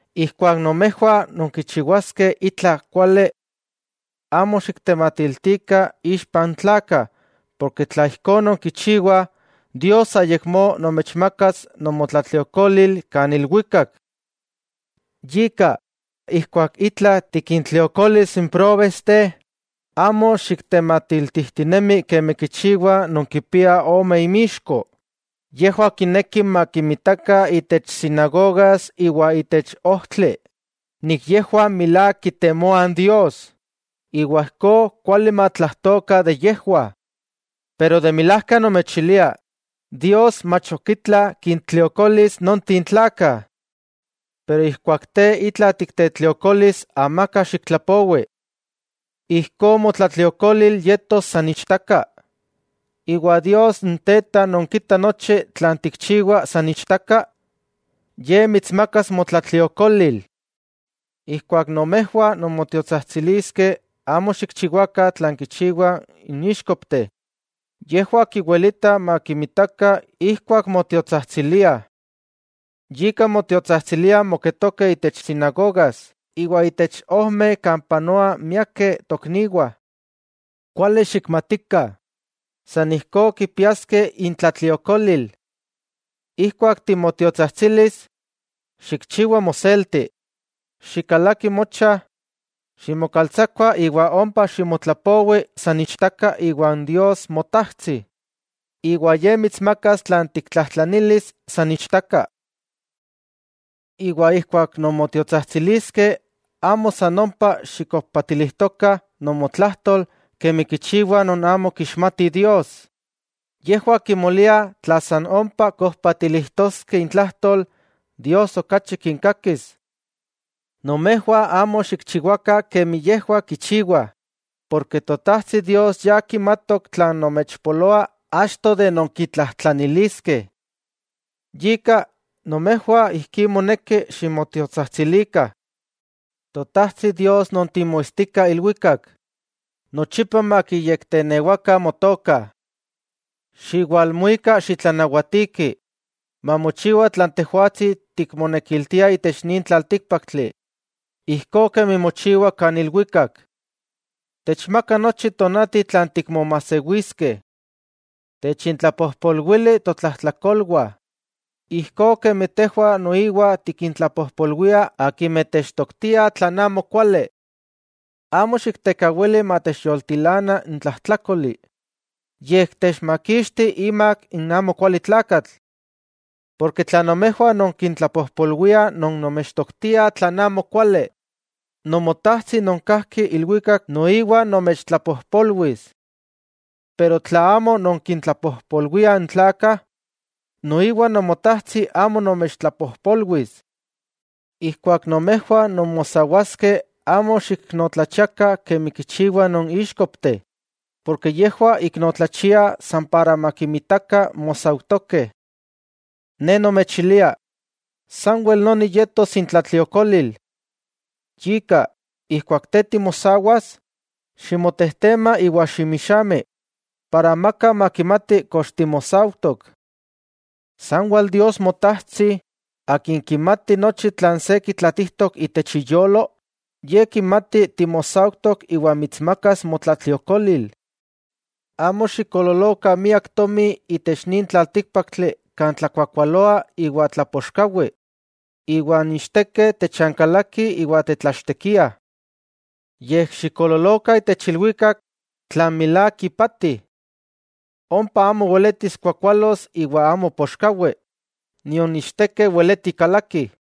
'Ijkuak nomejwah nonkichiwaskeh itla kuali, amo xiktematiltikah ixpa n tlakah, porke tla ijkó nonkichiwah, Dios ayakmó nomechmakas nomotlatliokolil kan ilwikak. Yika, ijkuak itla tikintliokolis n próbesteh, amo xiktematiltijtinemi kemi kichiwah non kipiah ome imixko. Yejwah kinekih makinmitakah itech sinagogas iwa itech ojtli yejwah milák kitemoah Dios, iwa ijkó kuali matlajtokah de yejwah. Pero de milajka nomechilia, Dios mach ok itla kintliokolis nonteh tlakah. Pero ijkuak te itla tiktetliokolis, amaka xiktlapowi. Ijkó motlatliokolil yetos san ichtaka, iwa Dios n Teta non kita nochi tlan tikchiwa san ichtaka, Ye mitsmakas motlatliokolil. 'Ijkuak nomejwah nonmotiotsajtsiliskeh, amo xikchiwakah tlan kichiwah n íxkopteh, yejwah kiwilitah makinmitakah ijkuak motiotsajtsiliah. Yika motiotsajtsiliah moketokeh itech sinagogas iwa itech ojmeh kan panoah miakeh tokniwah. Kuali xikmatikah, san ijkó kipiaskeh intlatliokolil. Ijkuak timotiotsajtsilis, xikchiwa moselti. Xikalaki mocha, ximokaltsakua iwa ompa ximotlapowi san ichtaka iwa n Dios Motajtsi, iwa Ye mitsmakas tlan tiktlajtlanilis san ichtaka. 'Iwa ijkuak nonmotiotsajtsiliskeh, amo san ompa xikojpatilijtokah nomotlajtol kemi kichiwah non amo kixmatih Dios, yejwah kimoliah tla san ompa kojpatilijtoskeh intlajtol, Dios okachi kinkakis. Nomejwah amo xikchiwakah kemi yejwah kichiwah, porke Totajtsi Dios ya kimatok tlan nomechpoloa achto de nonkitlajtlaniliskeh. Yika, nomejwah ijkí moneki ximotiotsajtsilikah: Totajtsi Dios non timoitstika ilwikak, nochipa makiyektenewakah motoka. Xiwalmuika xitlanawatiki, mamochiwa tlan Tejwatsi tikmonekiltia itech nin tlaltíkpaktli, ijkó kemi mochiwa kan ilwikak. Techmaka nochi tonati tlan tikmomajsewiskeh. Techintlapojpolwili totlajtlakolwah, ijkó kemi tejwah noiwa tikintlapojpolwiah akimeh techtoktiah tlan amo kuali. Amo xiktekawili matechyoltilana n tlajtlákoli, yej techmakixti imak n amokualitlakatl. 'Tla nomejwah nonkintlapojpolwiah non nomechtoktiah tlan amo kuali, Nomotajtsi non kajki ilwikak noiwa nomechtlapojpolwis. Pero tla amo nonkintlapojpolwiah n tlakah, noiwa Nomotajtsi amo nomechtlapojpolwis. 'Ijkuak nomejwah nonmosawaskeh, amo xiiknotlachiakah kemi kichiwah non íxkopteh. Yejwah iknotlachiah san para makinmitakah mosaujtokeh. Ne nomechilia, sanwel noni yetos intlatliokolil. Yika, ijkuak te timosawas, ximotejtema iwa ximixami, para amaka makimati kox timosaujtok. Sanwel Dios Motajtsi, Akin kimati nochi tlan se kitlatijtok itech iyolo, Ye kimati timosaujtok iwa mitsmakas motlatliokolil. 'Amo xikoololokah miak tomi itech nin tlaltíkpaktli kan tlakuakualoa iwa tlapoxkawi, iwa n ichtekeh techankalakih iwa tetlachtekiah. Yej xikoololokah itech ilwikak tlan milák ipati. Ompa amo weletis kuakualos iwa amo poxkawi, nion ichtekeh weleti kalakih.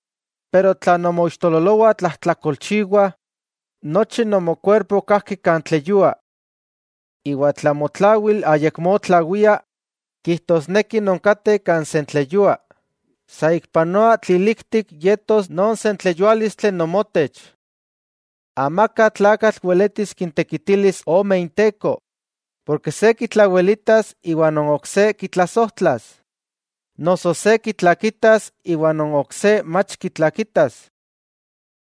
Pero tla nomoixtololowah tlajtlakolchiwah, nochi nomokuerpo kajki kan tleyua. Iwa tla motlawil ayakmó tlawia, kijtosneki nonkateh kan sentleyua, ¡saikpanoa tliliktik yetos non sentleyuálistli nomotech! 'Amaka tlakatl weletis kintekitilis ome inteko, porke se kitlawelitas iwa non ok se kitlasojtlas, noso se kitlakitas iwa non ok se mach kitlakitas.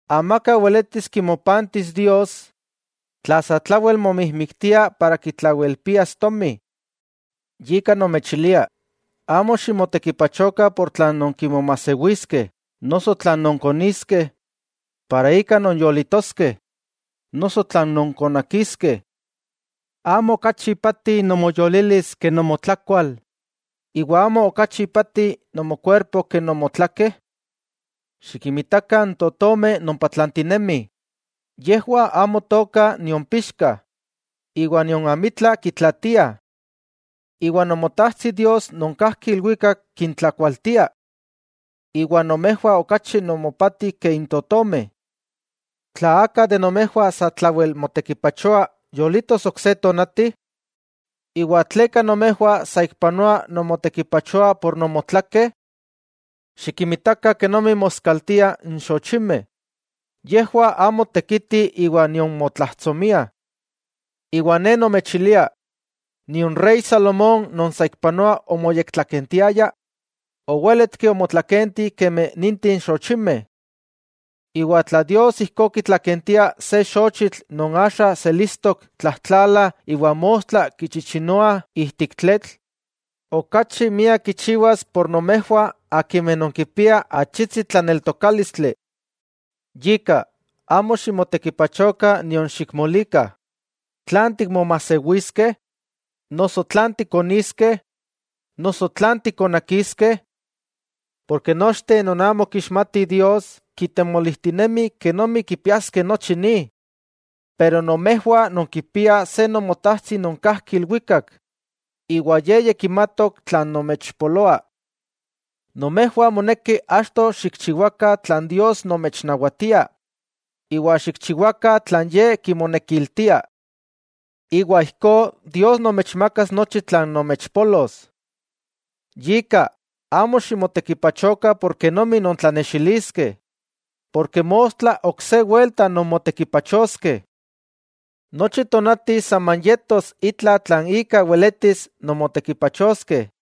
Amaka weletis kimopantis Dios tla satlawel momijmiktia para kitlawelpias tomi. 'Yika nomechilia: Amo ximotekipachokah por tlan nonkimomajsewiskeh noso tlan nonkoniskeh para ika nonyolitoskeh, noso tlan nonkonakiskeh. ¿Amo okachi ipati nomoyolilis ke nomotlakual, iwa amo okachi ipati nomokuerpo ke nomotlakeh? Xikinmitakah n totomeh non patlantinemih, yejwah amo tookah nion pixkah, iwa nion amitla kitlaatiah. Iwa Nomotajtsi Dios non kajki ilwikak kintlakualtia. ¡Iwa nomejwah okachi nomopati ke n totomeh! ¿Tla aka de nomejwah satlawel motekipachoa, yolitos ok se tonati? '¿Iwa tleka nomejwah saikpanoa nonmotekipachoah por nomotlakeh? Xikinmitakah kenomi moskaltiah n xochimeh, yejwah amo tekitih iwa nion motlajtsomiah. Iwa Ne nomechilia nion rey Salomón non saikpanoa omoyektlakentiaya, owéletki omotlakenti kemi ninteh xochimeh. Iwa tla Dios ijkó kitlakentia se xochitl non axa selistok tlajtlala iwa mostla kichichinoah ijtik tletl, ¡okachi miak kichiwas por nomejwah akimeh nonkipiah achitsi tlaneltokálistli! Yika, amo ximotekipachokah nion xikmolikah: “¿Tlan tikmomajsewiskeh? noso ¿tlan tikoniskeh? noso ¿tlan tikonakiskeh?” Porke nochteh non amo kixmatih Dios kitemolijtinemih kenomi kipiaskeh nochi ni, pero nomejwah nonkipiah se Nomotajtsi non kajki ilwikak, iwa Ye ya kimatok tlan nomechpoloa. Nomejwah moneki achto xikchiwakah tlan Dios nomechnawatia iwa xikchiwakah tlan Ye kimonekiltia. Iwa ijkó Dios nomechmakas nochi tlan nomechpolos. Yika, amo ximotekipachokah kenomi nontlanexiliskeh, porke mostla ok se welta nonmotekipachoskeh. Nochi tonati saman yetos itla tlan ika weletis nonmotekipachoskeh.